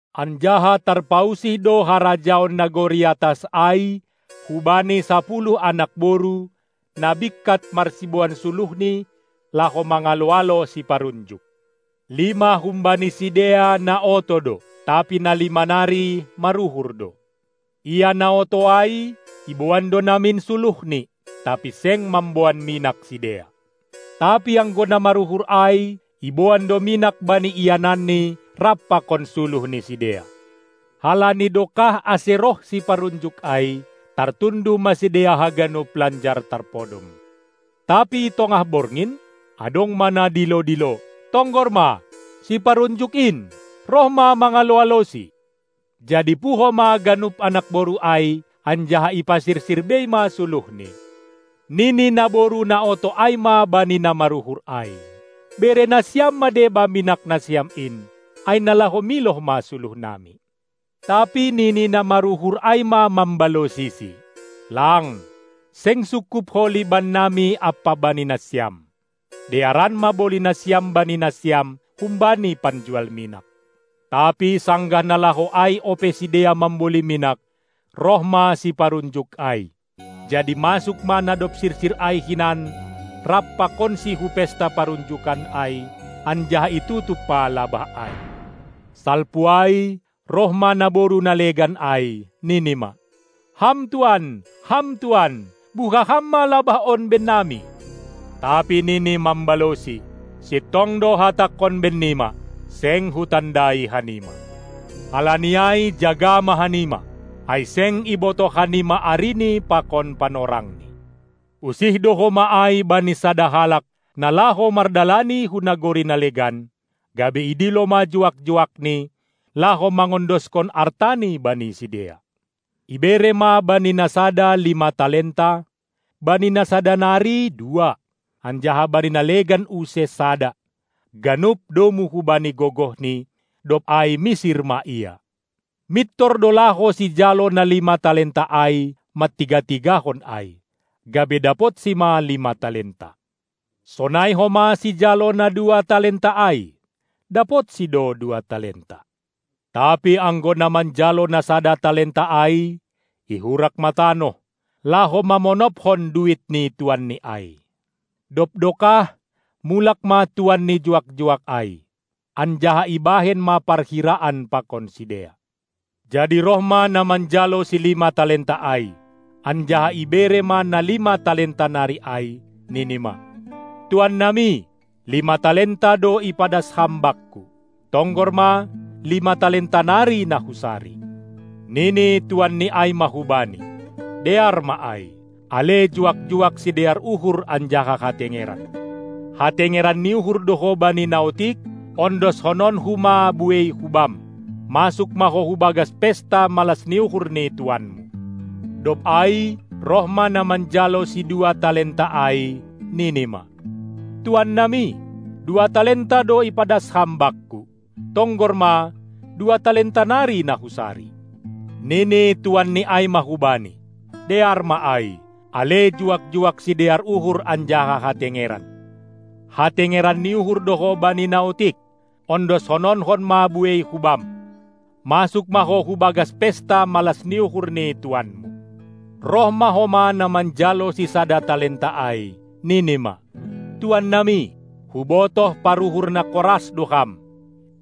Anjaha tarpausih do harajaon nagori atas ai hubani sapuluh anak boru, na bingkat marsiboan suluhni, laho mangalo-alo siparunjuk. Lima humbani sidea na oto do, tapi na lima nari maruhur do. Ia na oto ai iboan do namin suluhni, tapi seng mamboan minak sidea. Tapi anggo na maruhur ai, iboan do minak bani iananni rap pakon suluh ni sidea. Halani dokah ase roh siparunjuk ai, tartunduh ma sidea haganup lanjar tarpodom. Tapi tongah borngin, adong ma na dilo-dilo: Tonggor ma, siparunjuk in! Roh ma mangalo-alosi! Jadi puho ma ganup anakboru ai, anjaha ipasirsir bei ma suluhni. Nini naboru na oto ai ma bani na maruhur ai: Bere nasiam ma deba minak nasiam in, ai na laho miloh ma suluhnami! Tapi nini na maruhur ai ma mambalosisi: Lang! Seng sungkup holi bannami ampa bani nasiam. Dearan ma boli nasiam bani nasiam humbani panjual minak. Tapi sanggah na laho ai ope sidea mamboli minak, roh ma siparunjuk ai, jadi masuk ma na dob sirsir ai hinan rap pakonsi hu pesta parunjukan ai, anjaha itutup ma labah ai. Salpu ai roh ma naboru na legan ai, nini ma: Ham tuan, ham tuan, buha ham ma labah on bennami! Tapi nini mambalosi: Sintong do hatangkon bennima: Seng hutandai hanima! Halani ai jaga ma hanima, ai seng ibotoh hanima arini pakon panorangni. Usih do homa ai bani sada halak, na laho mardalani hu nagori na legan, gabe idilo ma juak-juakni, laho mangondoskon artani bani sidea. Ibere ma bani na sada lima talenta, bani na sada nari dua, anjaha bani na legan use sada, ganup domu hubani gogohni, dob ai misir ma ia. Mintor do laho sijalo na lima talenta ai, mantiga-tigahon ai, gabe dapotsi ma lima talenta. Sonai homa sijalo na dua talenta ai, dapotsi do dua talenta. Tapi anggo na manjalo na sada talenta ai ihurak ma tanoh, laho mamonopkon duit ni tuanni ai. Dob dokah mulak ma tuan ni juak-juak ai, anjaha ibahen ma parhiraan pakon sidea. Jadi roh ma na manjalo silima talenta ai, anjaha ibere ma na lima talenta nari ai, nini ma: Tuannami, lima talenta do ipadas ham bakku; tonggor ma, lima talenta nari na husari. Nini tuanni ai ma hubani: Dear ma ai, ale juak-juak sidear uhur anjaha hatengeran. Hatengeran ni uhur do ho bani na otik, ondoskononku ma buei hubam. Masuk ma ho hubagas pesta malas ni uhur ni tuanmu! Dob ai roh ma na manjalo sidua talenta ai, nini ma: Tuannami, dua talenta do ipadas ham bakku, tonggor ma, dua talenta nari na husari! Nini tuanni ai ma hubani: Dear ma ai, ale juak-juak sidear uhur anjaha hatengeran. Hatengeran ni uhur do ho bani na otik, ondoskononkon ma buei hubam. Masuk ma ho hu bagas pesta malas ni uhur ni tuanmu! Roh ma homa na manjalo sisada talenta ai, nini ma: Tuannami, hubotoh paruhur na koras do ham,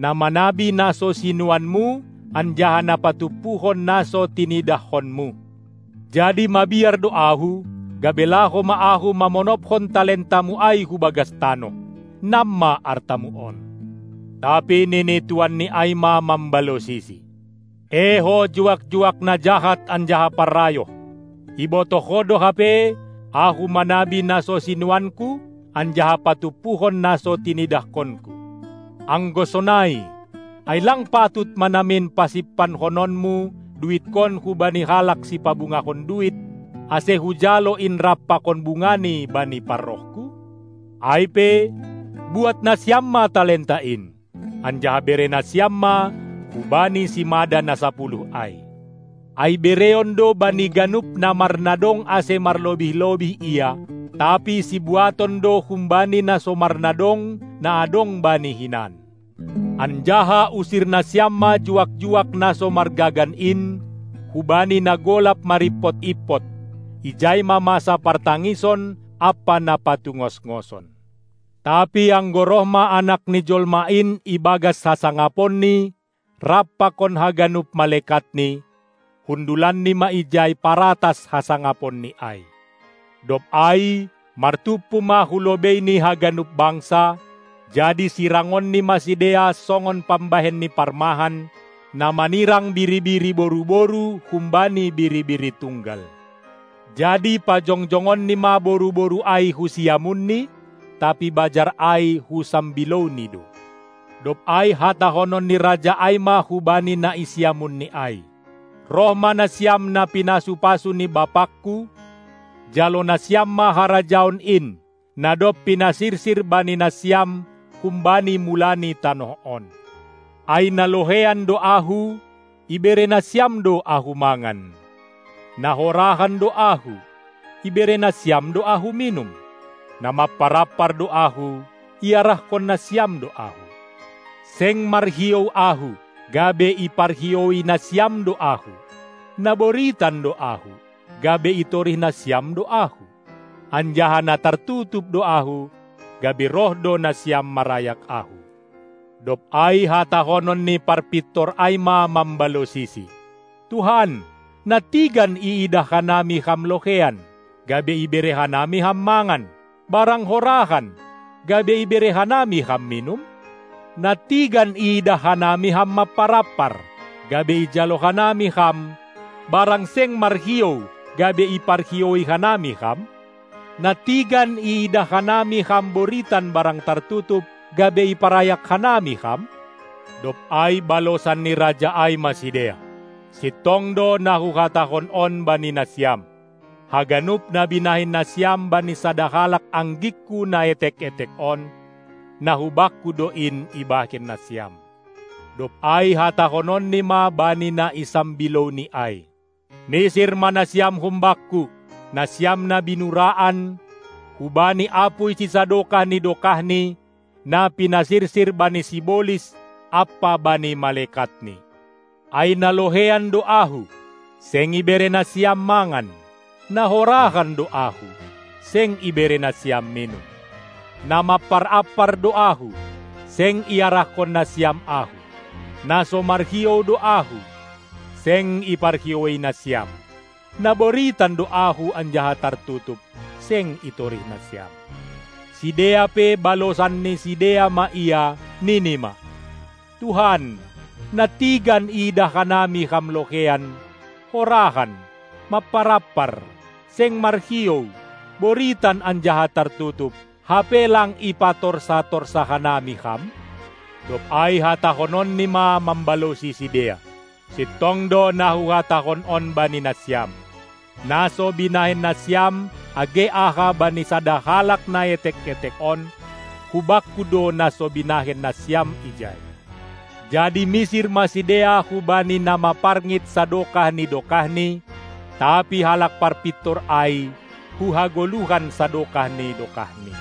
na manabi na so sinuanmu anjaha na patumpuhon na so tinidahkonmu. Jadi mabiar do ahu, gabe laho ma ahu mamonophon talentamu ai hu bagas, tanoh. Nam ma artamu on! Tapi nini tuanni ai ma mambalosisi: E ho juak-juak na jahat anjaha parrayoh! Ibotoh ho do hape, ahu manabi na so sinuanku, anjaha patumpuhon na so tinidahkonku. Anggo sonai, ai lang patut ma namin pasimpankononmu duitkon hubani halak sipabungahon duit, ase hujalo in rap pakon bungani bani parrohku? Ai pe, buat nasiam ma talenta in, anjaha bere nasiam ma hubani simada na sapuluh ai. Ai bereon do bani ganup na marnadong ase marlobih-lobih ia, tapi sibuaton do humbani na so marnadong na adong bani hinan. Anjaha usir nasiam ma juak-juak na so margagan in hubani na golap marimpot-impot! Ijai ma masa partangison ampa na patungosngoson. Tapi anggo roh ma Anak ni Jolma in ibagas hasangaponNi rap pakon haganup malekatNi, hundulanNi ma ijai paratas hasangaponNi ai. Dob ai martumpu ma hu lobeiNi haganup bangsa, jadi sirangonNi ma sidea songon pambahen ni parmahan na manirang biri-biri boru-boru humbani biri-biri tunggal. Jadi pajongjongonNi ma boru-boru ai hu siamunNi, tapi bajar ai hu sambilouNi do. Dob ai hatahonon ni Raja ai ma hubani na i siamunNi ai: Roh ma nasiam na pinasu-pasu ni BapangKu, jalo nasiam ma harajaon in, na dob pinasirsir bani nasiam humbani mula ni tanoh on! Ai na loheian do Ahu, ibere nasiam do Ahu mangan, na horahan do Ahu, ibere nasiam do Ahu minum; na mampar-ampar do Ahu, iarahkon nasiam do Ahu; seng marhiou Ahu, gabe iparhioui nasiam do Ahu; na boritan do Ahu, gabe itorih nasiam do Ahu, anjaha na tartutup do Ahu, gabe roh do nasiam marayak Ahu. Dob ai hatahonon ni parpintor ai ma mambalosisi: Tuhan, nantigan iidah hanami Ham loheian, gabe ibere hanami Ham mangan, barang horahan, gabe ibere hanami Ham minum? Nantigan iidah hanami Ham mampar-ampar, gabe ijalo hanami Ham, barang seng marhiou, gabe iparhioui hanami Ham? Nantigan iidah hanami Ham boritan barang tartutup, gabe iparayak hanami Ham? Dob ai balosan ni Raja ai ma sidea: Sintong do na Huhatahon on bani nasiam: Haganup na binahen nasiam bani sada halak anggingKu na etek-etek on, na hu Bakku do in ibahen nasiam. Dob ai hatahononNi ma bani na i sambilouNi ai: Misir ma nasiam hum Bakku, nasiam na binuraan, hubani apuy sisadokah ni dokahni, na pinasirsir bani sibolis ampa bani malekatni. Ai na loheian do Ahu, seng ibere nasiam mangan, na horahan do Ahu, seng ibere nasiam minum. Na mampar-ampar do Ahu, seng iarahkon nasiam Ahu, na so marhiou do Ahu, seng iparhioui nasiam; na boritan do Ahu anjaha tartutup, seng itorih nasiam. Sidea pe balosan ni sidea ma Ia, nini ma: Tuhan, nantigan iidah hanami Ham loheian, horahan, mampar-ampar, seng marhiou, boritan anjaha tartutup, hape lang ipatorsa-torsa hanami Ham? Dob ai hatahononNi ma mambalosi sidea: Sintong do na Huhatahon on bani nasiam, na so binahen nasiam age aha bani sada halak na etek-etek on, hu Bakku do na so binahen nasiam ijai. Jadi misir ma sidea hubani na maparngit sadokah ni dokahni, tapi halak parpintor ai hu hagoluhan sadokah ni dokahni.